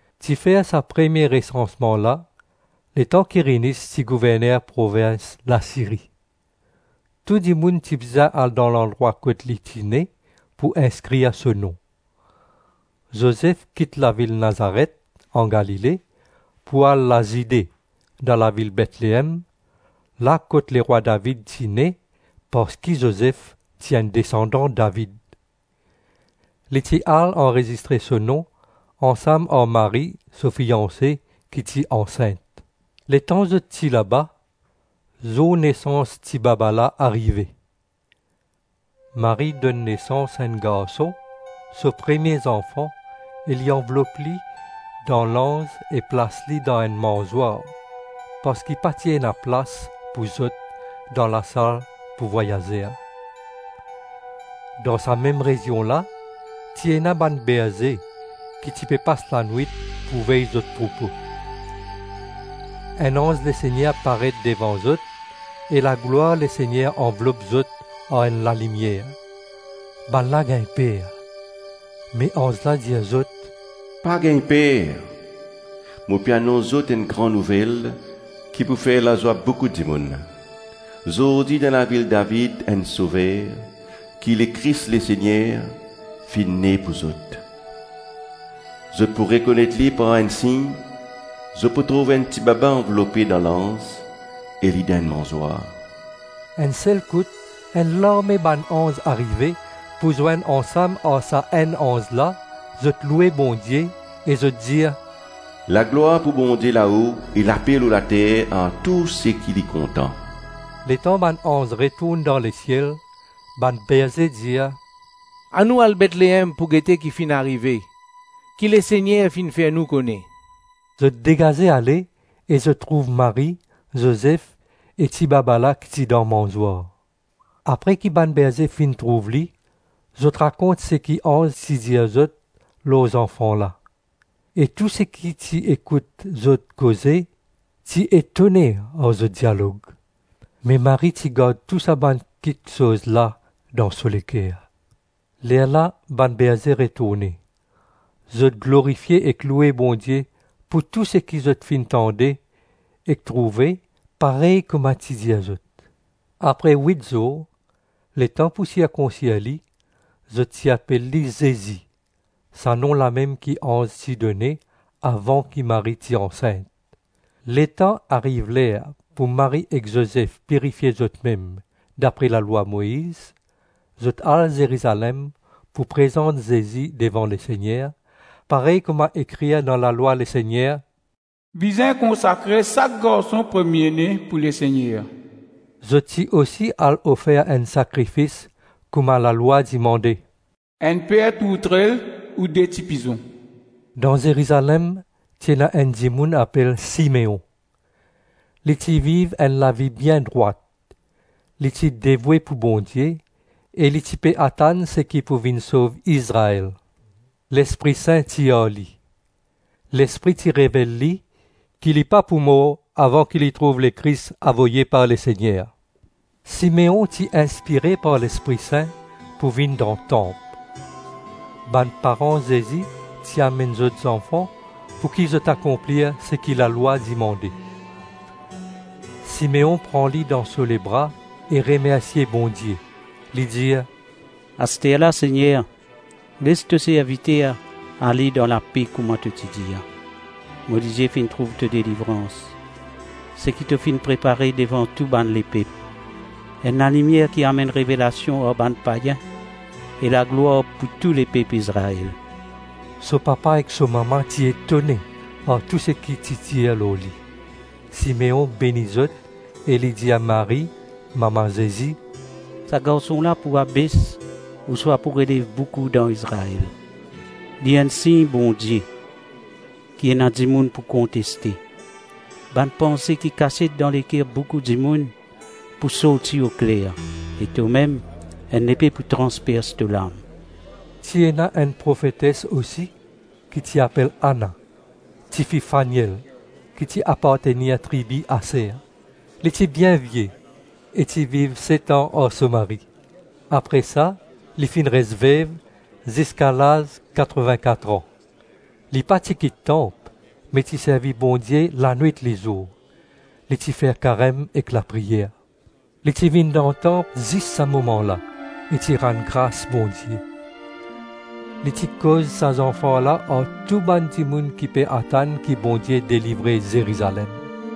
Ti fer sa premie resansman la letan Kirinyis ti gouverner provins Lasiri. Tou dimoun ti bizin al dan landrwa kot li ti ne, pou inskrir so nom. Zozef kit lavil Nazaret, an Galile, pou al Lazide dan lavil Betleem, la kot lerwa David ti ne, parski Zozef ti enn desandan David. Li ti al anrezistre so nom ansam ar Marie, so fianse, ki ti ansint. Letan zot ti laba, zour nesans tibaba la arive. Marie donn nesans enn garson, so premie zanfan e li anvlop li dan lanz e plas li dan enn manzwar, parski pa ti ena plas pou zot dan lasal pou vwayazer. Dan sa mem rezion la ti ena bann berze ki ti pe pas lanwit pou vey zot troupo. Enn anz Lesegner paret devan zot e laglwar Lesegner anvlop zot ar enn lalimier. Bannla gagn per. Me anz la dir zot, “Pa gagn per, mo pe anons zot enn gran nouvel ki pou fer lazwa boukou dimoun: zordi dan lavil David, enn Sover, ki Lekris Lesegner, finn ne pou zot. Zot pou rekonet li par enn sign, zot pou trouv enn tibaba anvlope dan lanz e li dan enn manzwar.” Enn sel kout enn larme bann anz arive pou zwenn ansam ar sa enn anz la, zot loue Bondie e zot dir: “Laglwar pou Bondie lao e lape lor later ar tou seki li kontan.” Letan bann anz retourn dan lesiel, bann berze dir, “Anou al Betleem pou gete ki finn arive, ki Lesegner finn fer nou kone.” Zot degaze ale, e zot trouv Marie, Zozef, e tibaba la ki ti dan manzwar. Apre ki bann berze finn trouv li, zot rakont seki anz ti dir zot lor zanfan la. E tou seki ti ekout zot koze ti etone ar zot dialog. Me Marie ti gard tou sa bann kiksoz la dan so leker. Lerla bann berze retourne; zot glorifie ek loue Bondie pou tou seki zot finn tande ek trouve parey kouma ti dir zot. Apre wit zour, letan pou sirkonsir li, zot ti apel li Zezi, sa nom lamem ki anz ti done, avan ki Marie ti ansint. Letan ariv ler pou Marie ek Zozef pirifie zotmem dapre lalwa Moiz, zot al Zerizalem pou prezant Zezi devan Lesegner, parey kouma ekrir dan lalwa Lesegner: “Bizin konsakre sak garson premie-ne pou Lesegner.” Zot ti osi al ofer enn sakrifis kouma lalwa dimande: “Enn per tourtrel ou de ti pizon.” Dan Zerizalem ti ena enn dimoun apel Simeon. Li ti viv enn lavi bien drwat, li ti devoue pou Bondie e li ti pe atann seki pou vinn sov Izrael. Lespri Sin ti ar li. Lespri ti revel li ki li pa pou mor avan ki li trouv Lekris avoye par Lesegner. Simeon ti inspire par Lespri Sin pou vinn dan Tanp. Bann paran Zezi ti amenn zot zanfan pouki zot akonplir seki lalwa dimande. Simeon pran li dan so lebra e remersie Bondie, li dir, “Asterla, Segner, les to serviter ale dan lape kouma to ti dir. Mo lizie finn trouv to delivrans, Seki to finn prepare devan tou bann lepep; Enn lalimier ki amenn revelasion ar bann payin e laglwar pou to lepep Izrael.” So papa ek so mama ti etone ar tou seki ti dir lor li. Simeon beni zot, e li dir Marie, mama Zezi, “Sa garson la pou abes ouswa pou relev boukou dan Izrael, li enn sign Bondie, ki ena dimoun pou konteste. Bann panse ki kasiet dan leker boukou dimoun pou sorti okler, e tomem, enn lepe pou transpers to lam.” Ti ena enn profetes osi, ki ti apel Ana, tifi Faniel, ki apartenir tribi Aser. Li ti bien vie, e ti viv set-an ar so mari. Apre sa li finn res vev ziska laz katrovin-kat-ran. Li pa ti kit tanp, me ti servi Bondie lanwit-lizour; li ti fer karem ek lapriyer. Li ti vinn dan tanp zis sa moman la e ti rann gras Bondie. Li ti koz sa zanfan la ar tou bann dimoun ki pe atann ki Bondie delivre Zerizalem.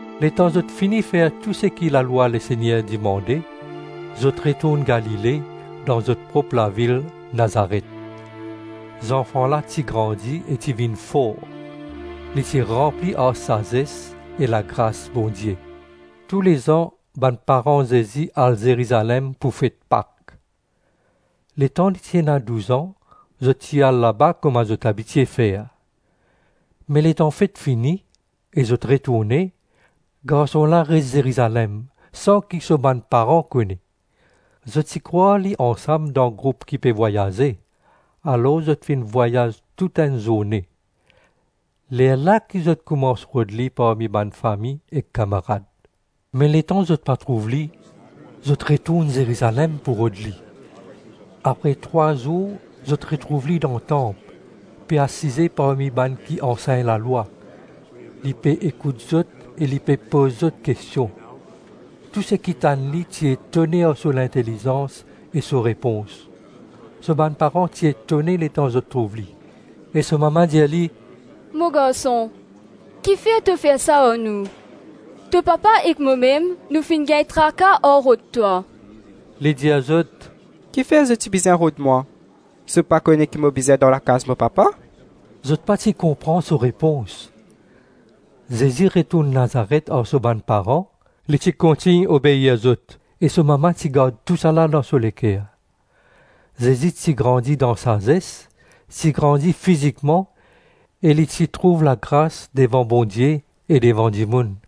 Letan zot fini fer tou seki lalwa Lesegner dimande, zot retourn Galile, dan zot prop lavil Nazaret. Zanfan la ti grandi e ti vinn for. Li ti ranpli ar sazes e lagras Bondie. Toulezan bann paran Zezi al Zerizalem pou fet Pak. Letan li ti ena douz-an zot ti al laba kouma zot abitie fer. Me letan fet fini, e zot retourne, garson la res Zerizalem, san ki so bann paran kone. Zot ti krwar li ansam dan group ki ti pe vwayaze, alor zot finn vwayaz toutenn zourne, lerla ki zot koumans rod li parmi bann fami e kamarad. Me letan zot pa trouv li zot retourn Zerizalem pou rod li. Apre trwa zour zot retrouv li dan tanp, pe asize parmi bann ki ansegn lalwa, li pe ekout zot e li pe poz zot kestion. Tou seki ti tann li ti etone ar so lintelizans e so repons. So bann paran ti etone letan zot trouv li, e so mama dir li, “Mo garson, kifer to fer sa ar nou? To papa ek momem nou finn gagn traka ar rod twa.” Li dir zot, “Kifer zot ti bizin rod mwa? Zot pa kone ki mo bizin dan lakaz mo Papa?” Zot pa ti konpran so repons. Zezi retourn Nazaret ar so bann paran. Li ti kontign obeir zot; e so mama ti gard tousala dan so leker. Zezi ti grandi dan sazes, ti grandi fizikman, e li ti trouv lagras devan Bondie e devan dimoun.